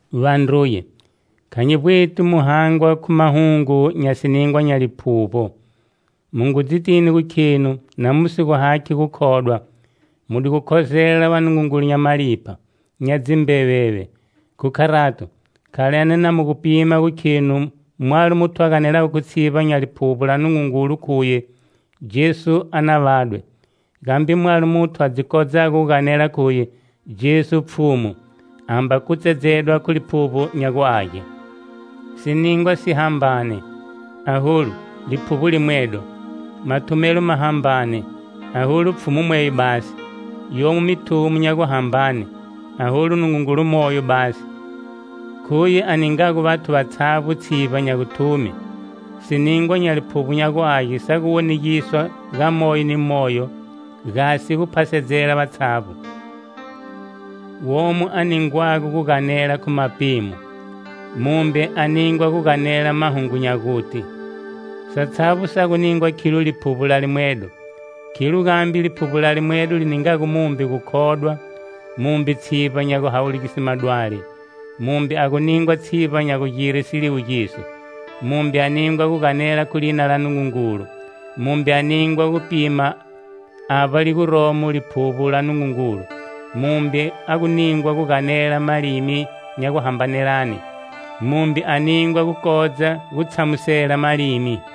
Vandruye, kha nyi vbweti mu hangwa khu mahungu nya siningwa nya Liphuvbo. Mu ngu dzitini gu khenu na mu si gu hakhi gukhodwa, mu di gu khozela vanungungulu nya malipha, nya dzimbeveve. Khu kharato, khalani na mu gu pima gu khenu mwalo muthu a ganelago khu tshivba nya Liphuvbo la Nungungulu khuye: "Jesu a na vadwe"; Gambe mwalo muthu a dzi kodzago gu ganela khuye: "Jesu Pfhumu" amba kutsedzedwa khu Liphuvbo nya gu Age. Siningwa si hambane, aholu, Liphuvbo limwedo; Mathumelo ma hambane, aholu Pfhumu mweyo basi; Yomo mithumo nya guhambane, aholu Nungungulu Moyo basi. Khuye a ningago vathu vatshavbo tshivba nya guthume. Siningwa nya Liphuvbo nya gu Age sa gu wonegiswa ga moyo ni moyo, gasi gu phasedzela vatshavbo. Womo a ningwago gu ganela khu mapimo, mumbe a ningwa gu ganela mahungu nya guti. Satshavbo sa gu ningwa khilo Liphuvbo la limwedo. Khilo gambe Liphuvbo la limwedo li ningago mumbe gukhodwa, mumbe tshivba nya guhawulugise madwali; mumbe a gu ningwa tshivba nya gugire siliwugiso, mumbe a ningwa gu ganela khu lina la Nungungulu, mumbe a ningwa gupima avba li guromo Liphuvbo la Nungungulu; mumbe a gu ningwa guganela malimi nya guhambanelane, mumbe a ningwa gukodza gu tshamusela malimi.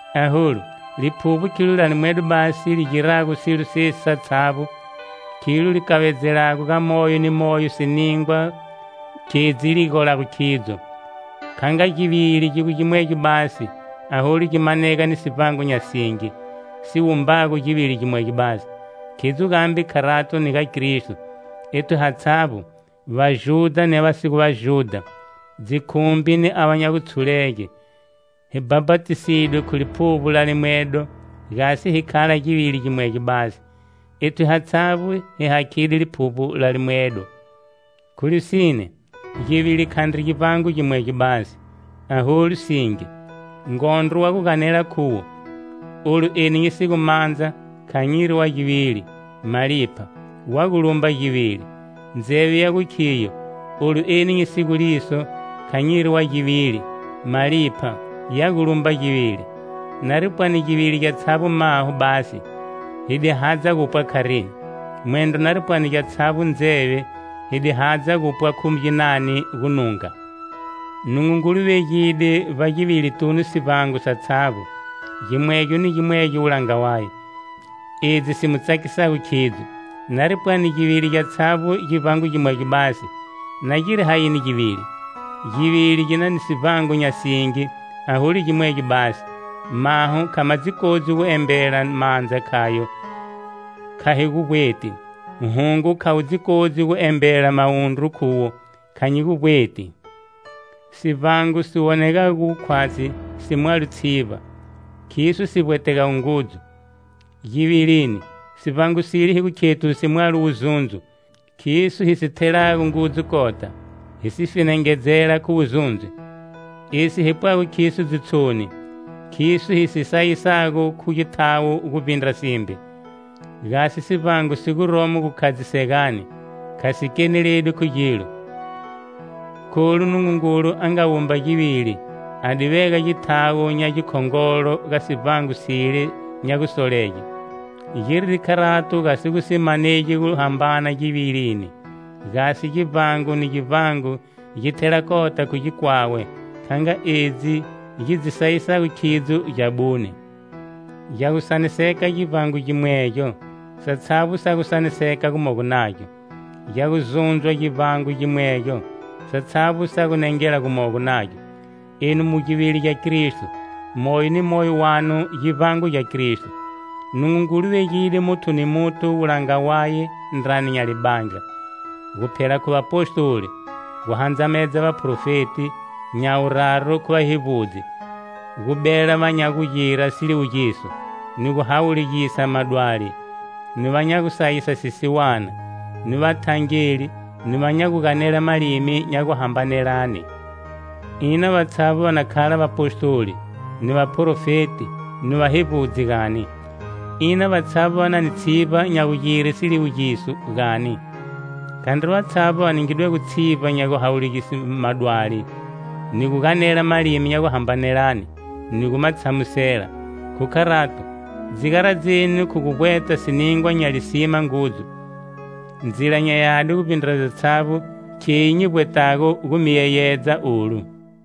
Aholu, Liphuvbo khilo la limwedo basi li girago silo sesi satshavbo; khilo li kavedzelago ga moyo ni moyo siningwa khedzi li golago khidzo. Kha nga givili gi gu gimwegyo basi aholu gi manega ni sivbango nya singi si wumbago givili gimwegyo basi, khidzo gambe kharato ni ga Kristo. Ethu hatshavbo: Vajudha ni ava va si gu Vajudha, dzikhumbi ni va nya gutshulega hi bhapatisidwe khu Liphuvbo la limwedo, gasi hi khala givili gimwegyo basi. Ethu hatshavbo hi hakhide Liphuvbo la limwedo. Khu lisine, givili khandri givbango gimwegyo basi, aholu singi. Ngondro wa gu ganela khuwo: "Olu eni nyi si gu mandza kha nyiri wa givili" malipha, wa gu lumba givili. Ndzeve ya gu khiyo: "Olu eni nyi si gu liso kha nyiri wa givili"; malipha, ya gu lumba givili. Nari pwani givili gyatshavbo maho basi, hi di hadza gupwa kharini? Mwendro nari pwani gyatshavbo ndzeve, hi di hadza gupwa khu ginani gununga? Nungungulu vegide vbagivilitunu sivbango satshavbo, gimwegyo ni gimwegyo wulanga waye, edzi si nga mu tsakisago khidzo. Nari pwani givili gyatshavbo givbango gimwegyo basi, na giri hayini givili? Givili gi na ni sivbango nya singi aholu gimwegyo basi. Maho kha ma dzi kodzi gu embela mandza khayo: "Kha hi gu vbweti". Hungo kha wu dzi kodzi gu embela mawundru khuwo "Kha nyi mi vbweti." Sivbango si wonegago gu khwatshi si mwalo tshivba, khiso si vbwetegago ngudzu. Givilini, sivbango sile hi gu khethu si mwalo wuzundzo, khiso hi si thelago ngudzu kota, hi si fenengedzela khu wuzundzo. Esi hi pwago khiso dzitshoni, khiso hi si sayisago khu githawo guvbindra simbe. Gasi sivbango si guromo gukhadzisegani, kha si keneledwi khu gilo, kholu Nungungulu a nga wumba givili a di vega githawo nya gikhongolo ga sivbango sile nya gusolege. Giride kharato gasi gu si manegi guhambana givilini, gasi givbango ni givbango gi thela kota khu gikwawe, kha nga edzi gi dzi sayisago khidzo gyabune. Gya gu saniseka givbango gimwegyo, satshavbo sa gu saniseka gumogo nagyo; gya gu zundzwa givbango gimwegyo, satshavbo sa gu nengela gumogo nagyo. Enu mu givili gya Kristo. Moyo ni moyo wanu givbango gya Kristo. Nungungulu vegide muthu ni muthu wulanga waye ndrani nya libandla: Guphela khu Vapostoli, gu handzamedza vaparofeti; nya wuraru khu vahevbudzi; gu bela va nya gugira siliwugiso ni gu hawulugisa madwali, ni va nya gusayisa sisiwana, ni vathangeli, ni va nya gu ganela malimi nya guhambanelane. Ina vatshavbo va na khala Vapostoli, ni vaprofeti ni vahevbudzi, gani? Ina vatshavbo va na ni tshivba nya gugire siliwugiso, gani? Khandri vatshavbo va ningidwego tshivba nya guhawulugise madwali, ni gu ganela malimi nya guhambanelane ni gu ma tshamusela. Khu kharato, dzi garadzeni khu gu vbweta siningwa nya lisima ngudzu. Ndzila nya yadi guvbindra dzatshavbo kheyi nyi vbwetago gu mi yeyedza olu.